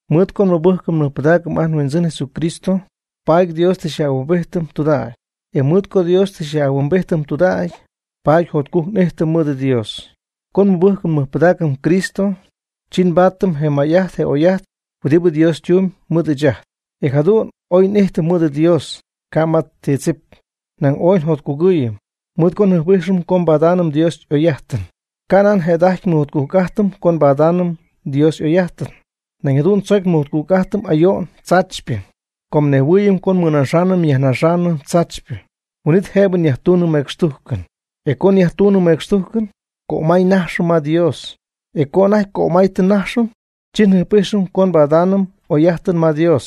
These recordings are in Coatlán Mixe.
Mɨɨd co nmɨbɨjcɨm nmɨjpɨdaacɨm ajt nHuindzɨn Jesucristo, paady Dios tɨ xyaj'ahuimbijtɨm tudägy. E mɨɨd co Dios tɨ xyaj'ahuimbijtɨm tudägy, paady jotcujc n'ijtɨm mɨɨd Dios. Co nmɨbɨjcɨm nmɨjpɨdaacɨm Cristo, chi nbaatɨm je may'ajt je oy'ajt huɨdibɨ Dios ytumyb mɨɨd ɨɨch ajt, e jadu'n oy n'ijtɨm mɨɨd Dios, ca' ma ti tzip. Nañ ooy njotcugɨɨyɨm, mɨɨd co njɨjp'ijxɨm co nbadaanɨm Dios y'oy'ajtɨn. Canan jëda'ajty nmɨjotcujc'ajtɨm co nbadaanɨm Dios y'oy'ajtɨn, nañ jadu'n tzoc mɨjotcujc'ajtɨm ayo'n tzaachypɨ. Com nejhuɨɨyɨm co nmɨnajxɨm nyajnajxɨm tzaachypɨ, huin'it jëbɨ nyajtunɨm mecxtujcɨn. E co nyajtunɨm mecxtujcɨn, cömay najxɨm ma Dios, e co anajty cömay tɨ nnajxɨm, chi njɨjp'ijxɨm co nbadaanɨm oy'ajtɨn ma Dios.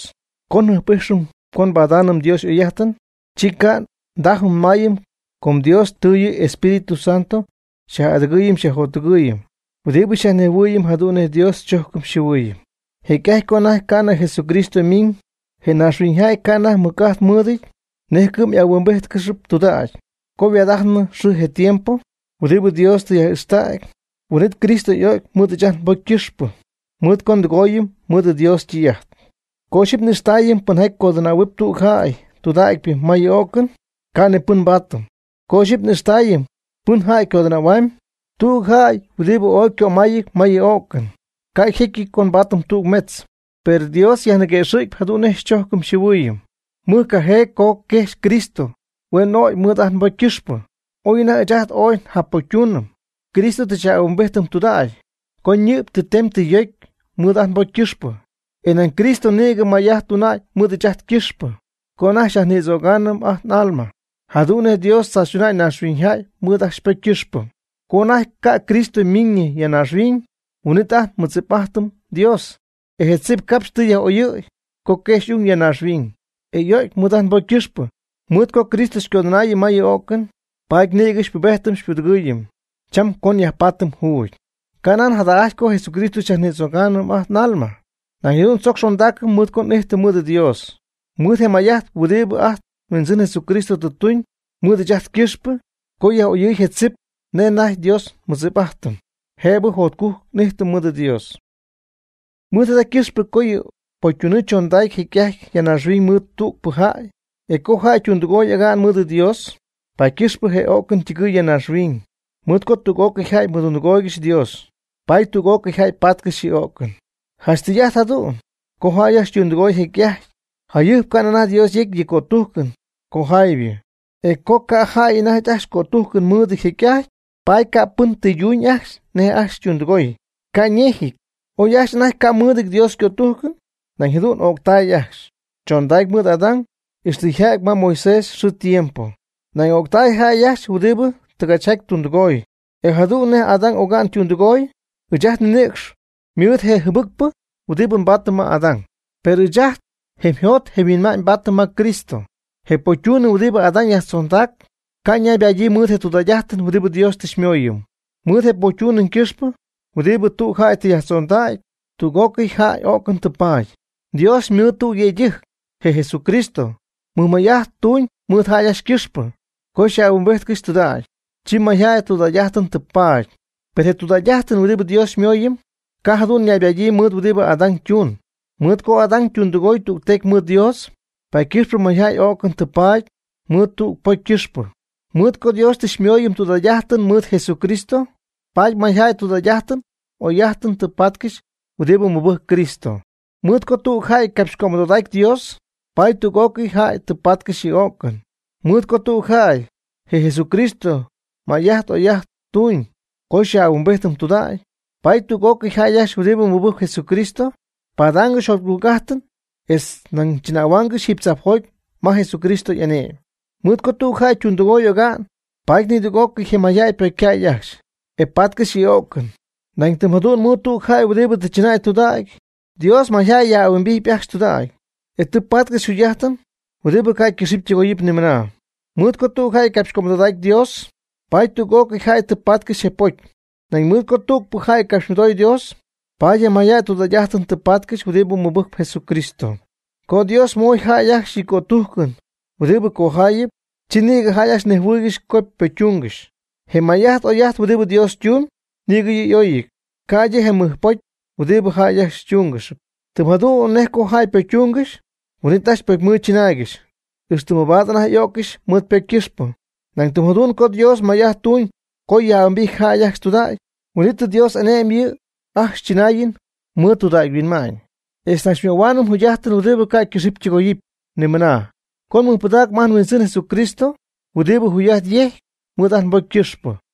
Com njɨjp'ijxɨm co nbadaanɨm Dios y'oy'ajtɨn, chi ca' ndajɨm nmayɨm com Dios tɨ yɨ' yEspíritu Santo xy'adɨgɨɨyɨm xyjottɨgɨɨyɨm huɨdibɨ xyajnejhuɨɨyɨm jadu'n nej Dios xychojcɨm xyjɨhuɨɨyɨm. Jecy'ajty co anajty ca'nɨ Jesucristo ymiñ, je naaxhuiñyjäy ca' anajty mɨc'ajt mɨɨdɨty nej cɨ'm y'ahuimbíjtcɨxɨpy tudägy. Co yhuaad'ajtnɨ je xɨɨ je tiempo huɨdibɨ Dios tɨ yaj'ixtägy, huin'it Cristo y'o'cy mɨɨd ɨɨch ajt nbocy ycɨxpɨ mɨɨd co ndɨgooyɨm mɨɨd Dios ytɨy'ajt. Co ixyipy n'ijxtaayɨm pɨnjaty codɨnähuɨp tüg jäy tudägypɨ ma yɨ o'cɨn, ca' ni pɨn nbaatɨm. Co iyxipy n'ijxtaayɨm pɨnjaty codɨnähuaamyb tüg jäy huɨdibɨ ooy ycömayɨty ma yɨ o'cɨn, ca' yjecyɨty co nbaatɨm tüg metz. Per Dios yajniquëxɨ̈cyp jadu'n nej xychojcɨm xyjɨhuɨɨyɨm mɨjcajee co quejxy Cristo huen o'cy mɨɨd ajt nbocy ycɨxpɨ, oy anajty ɨɨch ajt ooy njacpocytuunɨm. Cristo tɨ xyaj'ahuimbijtɨm tudägy co ñɨ'py tɨ temy tɨ yocy mɨɨd ajt nbocy ycɨxpɨ, e nañ Cristo nïgɨ may'ajt tuna'ñ mɨɨd ɨɨch ajt ycɨxpɨ co anajty xyajnïdzögaanɨm ajt n'alma, jadu'n nej Dios tzaachytuna'ñ naaxhuiñyjäy mɨɨd ajcxy ypocy ycɨxpɨ. Co anajty ca' Cristo ymiiñɨ ya naaxhuiñ, huin'it anajty nmɨdzip'ajtɨm Dios. Je tzip capxy tɨ Dios yaj'oyɨ̈y co quejxy y'ung ya naaxhuiñ, e y'o'cy mɨɨd ajt nbocy ycɨxpɨ. Mɨɨd co Cristo xycodɨnaayɨm ma yɨ o'cɨn, paady nïgɨ xypubejtɨm xypudɨgɨɨyɨm cham co yajpaady juugy. Canan jada'ajty co Jesucristo xyajnïdzögaanɨm ajt n'alma, nañ jadu'n tzoc xondaacɨm mɨɨd co n'ijtɨm mɨɨd Dios, mɨɨd je may'ajt huɨdibɨ ajt nHuindzɨn Jesucristo tɨ tuñ mɨɨd ɨɨch ajt ycɨxpɨ co yaj'oyɨɨy je tzip nej anajty Dios nmɨdzip'ajtɨm, jëbɨ jotcujc n'ijtɨm mɨɨd Dios. Mɨɨd jada ycɨxpɨ co yɨ pocytunɨɨ chondacy jecy'ajty ya naaxhuiñ mɨɨd tügpɨ jäy. E co jäy ytundɨgoy oga'n mɨɨd Dios, paady ycɨxpɨ je o'cɨn ytɨgɨɨy ya naaxhuiñ. Mɨɨd co tüg'ócɨy jäy mɨdundɨgooygɨxy Dios, paady tüg'ócɨy jäy patcɨxy yɨ o'cɨn. Janch tɨy'ajt jadu'n co jäy ajcxy ytundɨgooy jecy'ajty jayɨjp ca'nɨ anajty Dios yecy yɨ' ycötujcɨn cojaaybɨ, e co ca' jäy anajty ajcxy cötujcɨn mɨɨdɨty jecy'ajty, paady ca'pɨn tɨyduñ ajcxy nej ajcxy ytundɨgooy. Ca' ñejɨty, oy ajcxy anajty ca' mɨɨdɨty Dios ycötujcɨn, nañ jadu'n y'o'ctay ajcxy, chondacy mɨɨd Adán, ixtɨ yja'ty ma Moisés yxɨɨ ytiempo. Nañ o'ctay jäy ajcxy huɨdibɨ tɨgachjaty tundɨgooy, ca' yjadu'nɨty nej Adán oga'n ytundɨgooy. Ɨɨch ajt nninïcx ymɨɨd je jɨbɨcpɨ huɨdibɨ nbaatɨm ma Adán. Per ajt njemyjot njemyhuinma'ñ nbaatɨm ma Cristo. Je pocytunɨɨ huɨdibɨ Adán yajtzondac, ca' naybadyii mɨɨd je tudägy'ajtɨn huɨdibɨ Dios tɨ xyñimooyɨm. Mɨɨd je pocytunɨɨ ycɨxpɨ huɨdibɨ tüg jäy tɨ yajtzondägy, tüg'ócɨy jäy öcɨn tɨ paady. Dios mɨɨd tüg yëydɨjc, je Jesucristo, mɨjmay'ajt tuñ mɨɨd jäy ajcxy ycɨxpɨ co yaj'ahuimbijtcɨxy tudägy, chi mayjäy tudägy'ajtɨn tɨ paady. Per je tudägy'ajtɨn huɨdibɨ Dios xyñimooyɨm, ca' jadu'n naybadyii mɨɨd huɨdibɨ Adán ytuun. Mɨɨd co Adán ytundɨgoy tügtecy mɨɨd Dios, paady ycɨxpɨ mayjäy o'cɨn tɨ paady mɨɨd tüg pocy ycɨxpɨ. Mɨɨd co Dios tɨ xyñimooyɨm tudägy'ajtɨn mɨɨd Jesucristo, paady mayjäy tudägy'ajtɨn y'oy'ajtɨn tɨ patcɨxy huɨdibɨ mɨbɨjcp Cristo. Mɨɨd co tüg jäy capxycömɨdodacy Dios, paady tüg'ócɨy jäy tɨ patcɨxy yɨ o'cɨn. Mɨɨd co tüg jäy, je Jesucristo, may'ajt oy'ajt tuñ co xyaj'ahuimbijtɨm tudägy, paady tüg'ócɨy jäy ajcxy huɨdibɨ mɨbɨjcp Jesucristo ypadaangɨxyp jotcujc'ajtɨn etz nañ chɨnähuaangɨxy jiiby tzajpjoty ma Jesús y'ane'my. Mɨɨd co tüg jäy ytundɨgoy oga'n, paady nidüg'ócɨy je mayjäy ypocycäy ajcxy, e patcɨxy yɨ o'cɨn. Nañ tɨm jadu'n mɨɨd tüg jäy huɨdibɨ tɨ chɨnäy tudägy, Dios mayjäy yaj'ahuimbijty ajcxy tudägy, e tɨ patcɨxy yjugy'ajtɨn huɨdibɨ ca' ycɨxɨpy ytɨgoyɨpy nimɨna xɨɨ. Mɨɨd co tüg jäy capxycömɨdodacy Dios, paady tüg'ócɨy jäy tɨ patcɨxy je pocy. Nañ mɨɨd co tügpɨ jäy capxymɨdoy Dios, paady je mayjäy tudägy'ajtɨn tɨ patcɨxy huɨdibɨ mɨbɨjcpɨ Jesucristo. Co Dios moy jäy ajcxy yɨ' ycötujcɨn huɨdibɨ cojaayɨp, chi nïgɨ jäy ajcxy nejhuɨɨygɨxy co ypocytungɨxy. Je may'ajt oy'ajt huɨdibɨ Dios ytumyb, nïgɨ yɨ' y'oyɨty, ca'ydɨ je mɨjpocy huɨdibɨ jäy ajcxy ytungɨxyp. Tɨm jadu'n nej co jäy ypocytungɨxy, huin'it ajcxy pocymɨɨd chɨnaaygɨxy, ixtɨ mabaad anajty y'öccɨxy mɨɨd ypocy ycɨxpɨ. Nañ tɨm jadu'n co Dios may'ajt tuuñ co yaj'ahuimbity jäy ajcxy tudägy, huin'it Dios ane'my yɨ' ajcxy chɨnaayɨn mɨɨd tudägy huinma'ñ, etz nañ xymöhuaanɨm jugy'ajtɨn huɨdibɨ ca' ycɨxɨpy ytɨgoyɨpy nimɨna, co nmɨjpɨdaacɨm ajt nHuindzɨn Jesucristo huɨdibɨ yjugy'ajtɨn yejc mɨɨd ajt nbocy ycɨxpɨ.